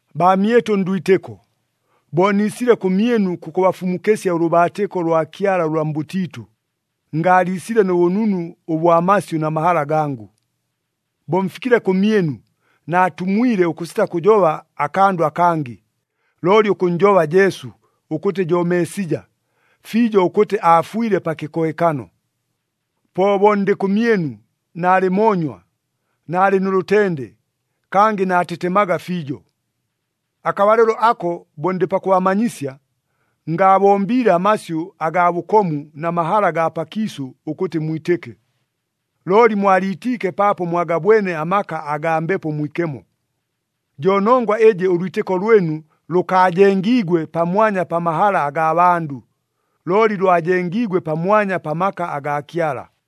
Baamyɨtʉ ndwitɨko, bo niisile kʉmyɨnu kʉkʉbafumukɨsya ʉlʉbaatɨko lwa Kyala ʉlwa mbʉtiitʉ, ngaaliisile nʉ bʉnunu ʉbwa masyʉ na mahala gangʉ. Bo mfikile kʉmyɨnu, naatumwile ʉkʉsita kʉjoba akandʉ akangɨ, looli ʉkʉnnjoba Jesu, ʉkʉtɨ jo Meesija, fiijo ʉkʉtɨ aafwile pa kɨkohekano. Po bo ndɨ kʉmyɨnu, naalɨ moonywa, naalɨ nʉ lʉtende, kangɨ naatetemaga fiijo. Akabalɨlo ako bo ndɨ pakʉbamanyisya, ngaabombiile amasyʉ agaa bʉkomu na mahala agaa pakiisʉ ʉkʉtɨ mwitɨke, looli mwaliitiike paapo mwagabwene amaka agaa Mbepo Mwikemo. Jo nongwa ɨjɨ ʉlwitɨko lwɨnu lʉkaajengiigwe pamwanya pa mahala agaa bandʉ, looli lwajengiigwe pamwanya pa maka agaa Kyala.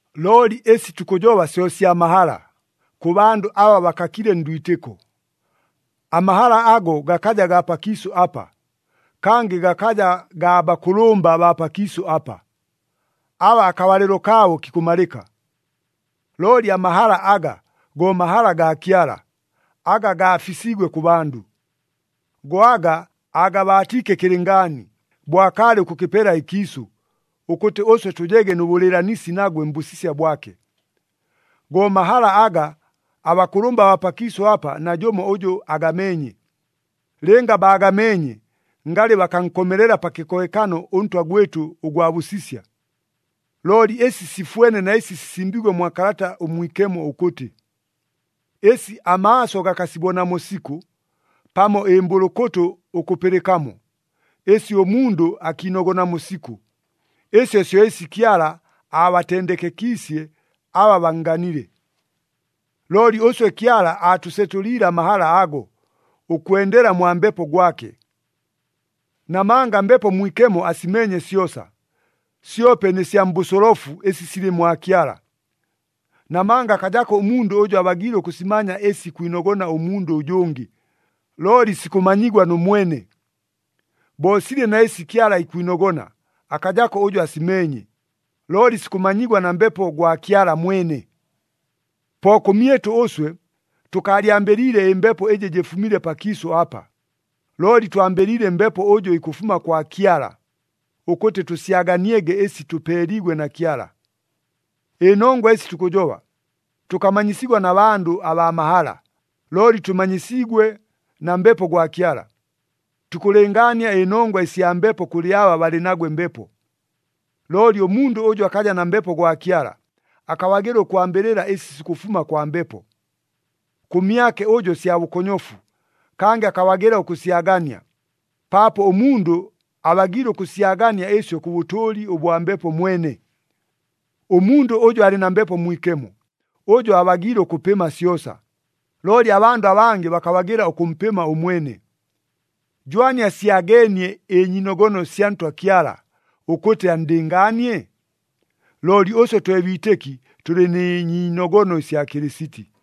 Looli ɨsi tukʉjoba syo sya mahala, kʉ bandʉ aba bakakile ndwitɨko. Amahala ago gakaja gaa pakiisʉ apa, kangɨ gakaja gaa bakʉlʉmba baa pakiisʉ apa, aba akabalɨlo kaabo kikʉmalɨka. Looli amahala aga, go mahala gaa Kyala, aga gaafisiigwe kʉ bandʉ. Go aga aagabaatiike kɨlɨngaani, bo akaalɨ ʉkʉkɨpela ɨkiisʉ, ʉkʉtɨ ʉswe tʉjege nʉ bʉlɨɨlanisi nagwe mbʉsisya bwake. Go mahala aga, abakʉlʉmba baa pakiisʉ apa najʉmo ʉjʉ agameenye. Lɨnga baagameenye, ngalɨ bakankomelela pa kɨkohekano ʉNtwa gwɨtʉ ʉgwa bʉsisya. Looli ɨsi sifwene na ɨsi sisimbiigwe mwa Kalata ʉMwikemo ʉkʉtɨ, “Ɨsi amaaso gakasibonamo sikʉ, pamo ɨmbʉlʉkʉtʉ ʉkʉpɨlɨkamo, ɨsi ʉmundʉ akiinogonamo sikʉ, ɨsyo syo ɨsi Kyala aabatendekekiisye aba bannganile.” Looli ʉswe Kyala aatʉsetʉliile amahala ago, ʉkwendela mwa Mbepo gwake. Namanga Mbepo Mwikemo asimeenye syosa, syope nɨ sya mbʉsolofu ɨsi silɨ mwa Kyala. Namanga akajako ʉmundʉ ʉjʉ abagiile ʉkʉsimanya ɨsi ikwinogona ʉmundʉ ʉjʉngɨ, looli sikʉmanyigwa nʉ mwene. Bo silɨ na ɨsi Kyala ikwinogona, akajako ʉjʉ asimeenye, looli sikʉmanyigwa na Mbepo gwa Kyala mwene. Po kʉmyɨtʉ ʉswe, tʉkaalyambɨliile ɨmbepo ɨjɨ jɨfumile pakiisʉ apa, looli twambɨliile Mbepo ʉjʉ ikʉfuma kwa Kyala, ʉkʉtɨ tʉsyaganiege ɨsi tʉpeeliigwe na Kyala. Ɨnongwa ɨsi tukʉjoba, tʉkamanyisigwa na bandʉ abaa mahala, looli tʉmanyisiigwe na Mbepo gwa Kyala. Tukʉlɨngaania ɨnongwa ɨsya Mbepo kʉlɨ aba balɨ nagwe Mbepo. Looli ʉmundʉ ʉjʉ akaja na Mbepo gwa Kyala, akabagɨla ʉkwambɨlɨla ɨsi sikʉfuma kwa Mbepo. Kʉmyake ʉjo sya bʉkonyofu, kangɨ akabagɨla ʉkʉsyagania, paapo ʉmundʉ abagiile ʉkʉsyagania ɨsyo kʉ bʉtʉʉli ʉbwa Mbepo mwene. Ʉmundʉ ʉjʉ alɨ na Mbepo Mwikemo, ʉjo abagiile ʉkʉpɨma syosa, looli abandʉ abangɨ bakabagɨla ʉkʉmpɨma ʉmwene. “Jwani asyageenie ɨnyiinogono sya Ntwa Kyala, ʉkʉtɨ anndɨngaanie?” Looli ʉswe twe biitɨki tʉlɨ nɨ nyiinogono ɨsya Kɨlɨsiti.